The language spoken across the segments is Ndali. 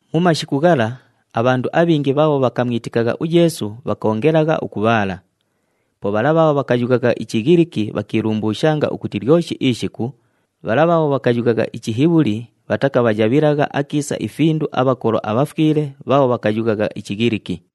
Mu mashiku ghala, abhandu abhingi bhaabho bhakamwitikagha uYeesu bhakoongelagha ukubhaala. Po bhala bhaabho bhakayughagha iChighiliki bhakiilumbuushanga ukuti lyoshi ishiku bhala bhaabho bhakayughagha iChihibhuli bhatakabhayabhilagha akiisa ifindu abhakolo abhafwile bhaabho bhakayughagha iChighiliki.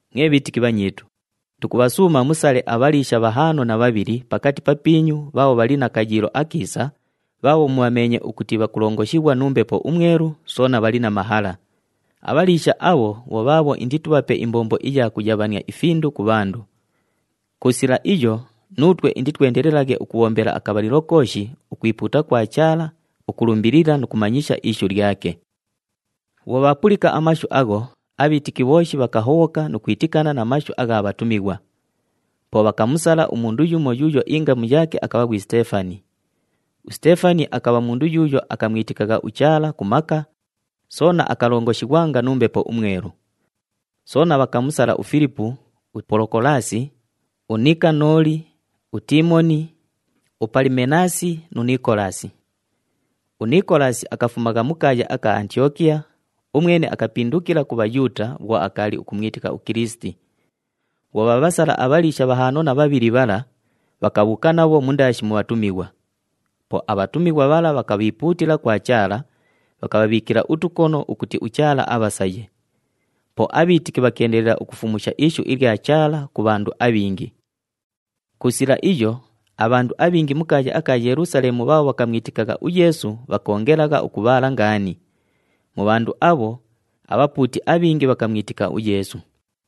Mwe bhiitiki bhanyiitu, tukubhasuuma musale abhaliisha bhahaano na bhabhili pakati papiinyu bhaabho bhali na kayiilo akiisa, bhaabho mubhameenye ukuti bhakulongoshighwa nu Mbepo uMwelu, soona bhali na mahala. Abhaliisha abho bho bhaabho inditubhape imbombo iya kuyabhania ifindu ku bhandu. Ku sila iyo, nuutwe inditwendelelaghe ukubhombela akabhalilo kooshi ukwipuuta kwa Chaala, ukulumbilila nu kumanyisha ishu lyake.” Bhwo bhaapulika amashu agho, abhiitiki bhooshi bhakahobhoka nu kwitikana na mashu agha bhatumighwa. Po bhakamusala umundu yumo yuuyo ingamu yaake akabha ghwi Siteefani. USiteefani akabha mundu yuuyo akamwitikagha uChaala ku maka, soona akalongoshighwanga nu Mbepo uMwelu. Soona bhakamusala uFilipu, uPolokolaasi, uNikanooli, uTiimoni, uPalimenaasi nu Nikolaasi. UNikolaasi akafumagha mu kaaya aka Antiyokiya, umwene akapindukila ku Bhayuuta bhwo akaali ukumwitika uKilisiti. Bhwo bhaabhasala abhaliisha bhahaano na bhabhili bhala, bhakabhuuka nabho mundaashi mu bhatumighwa. Po abhatumighwa bhala bhakabhiipuutila kwa Chaala, bhakabhabhiikila utukono ukuti uChaala abhasaye. Po abhiitiki bhakeendelela ukufumusha ishu ilya Chaala ku bhandu abhingi. Ku sila iyo, abhandu abhingi mu kaaya aka Yelusaleemu bhaabho bhakamwitikagha uYeesu bhakoongelagha ukubhaala ngaani. Mu bhandu abho, abhapuuti abhingi bhakamwitika uYeesu.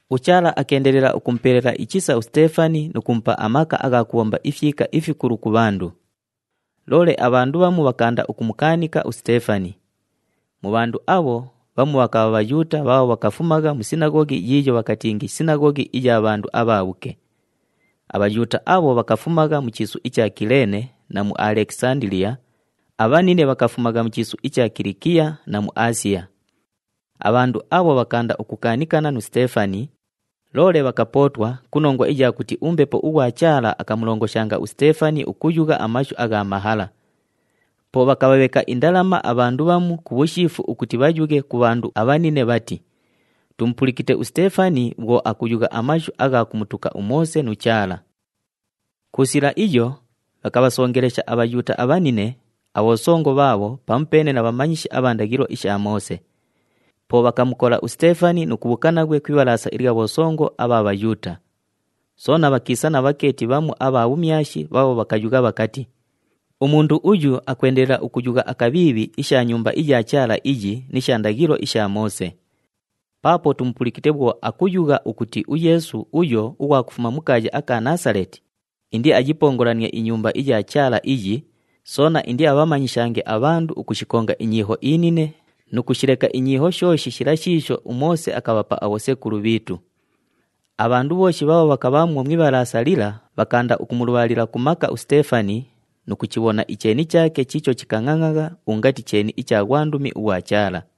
UChaala akeendelela ukumupelela ichisa uSiteefani nu kumupa amaka agha kubhomba ifyika ifikulu ku bhandu. Loole abhandu bhamu bhakaanda ukumukaanika uSiteefani. Mu bhandu abho, bhamu bhakabha Bhayuuta bhaabho bhakafumagha mu sinaghoghi yiiyo bhakatingi Sinaghoghi iya Bhandu aBhaabhuke. ABhayuuta abho bhakafumagha mu chiisu icha Kileene na mu Alekisandiliya, abhanine bhakafumagha mu chiisu icha Kilikiya na mu Aasiya. Abhandu abho bhakaanda ukukaanikana nu Siteefani, loole bhakapootwa ku nongwa iya kuti uMbepo ughwa Chaala akamulongoshanga uSiteefani ukuyugha amashu agha mahala. Po bhakabhabheka indalama abhandu bhamu ku bhushiifu ukuti bhayughe ku bhandu abhanine bhati, “Tumupulikite uSiteefani bhwo akuyugha amashu agha kumutuka uMoose nu Chaala.” Ku sila iyo, bhakabhasongelesha aBhayuuta abhanine, abhosongo bhaabho pamupeene na bhamanyishi abha ndaghilo isha Moose. Po bhakamukola uSiteefani nu kubhuuka naghwe ku Ibhalaasa ilya bhosongo abha Bhayuuta. Soona bhakiisa na bhakeeti bhamu abha bhumyashi bhaabho bhakayugha bhakati, “Umundu uyu akwendelela ukuyugha akabhiibhi isha Nyumba iya Chaala iyi ni sha ndaghilo isha Moose. Paapo tumupulikite bhwo akuyugha akuti uYeesu uyo ughwa kufuma mu kaaya aka Naasaleeti indiayipongolanie iNyumba iya Chaala iyi, soona indiabhamanyishange abhandu ukushikonga inyiiho inine nu kushileka inyiiho shooshi shila shiisho uMoose akabhapa abhosekulu bhiitu.” Abhandu bhooshi bhaabho bhakabhaamwo mu Ibhalaasa lila, bhakaanda ukumulubhaalila ku maka uSiteefani, nu kuchibhona icheeni chaake chiicho chikangʼangʼagha ungati cheeni icha ghwandumi ughwa Chaala.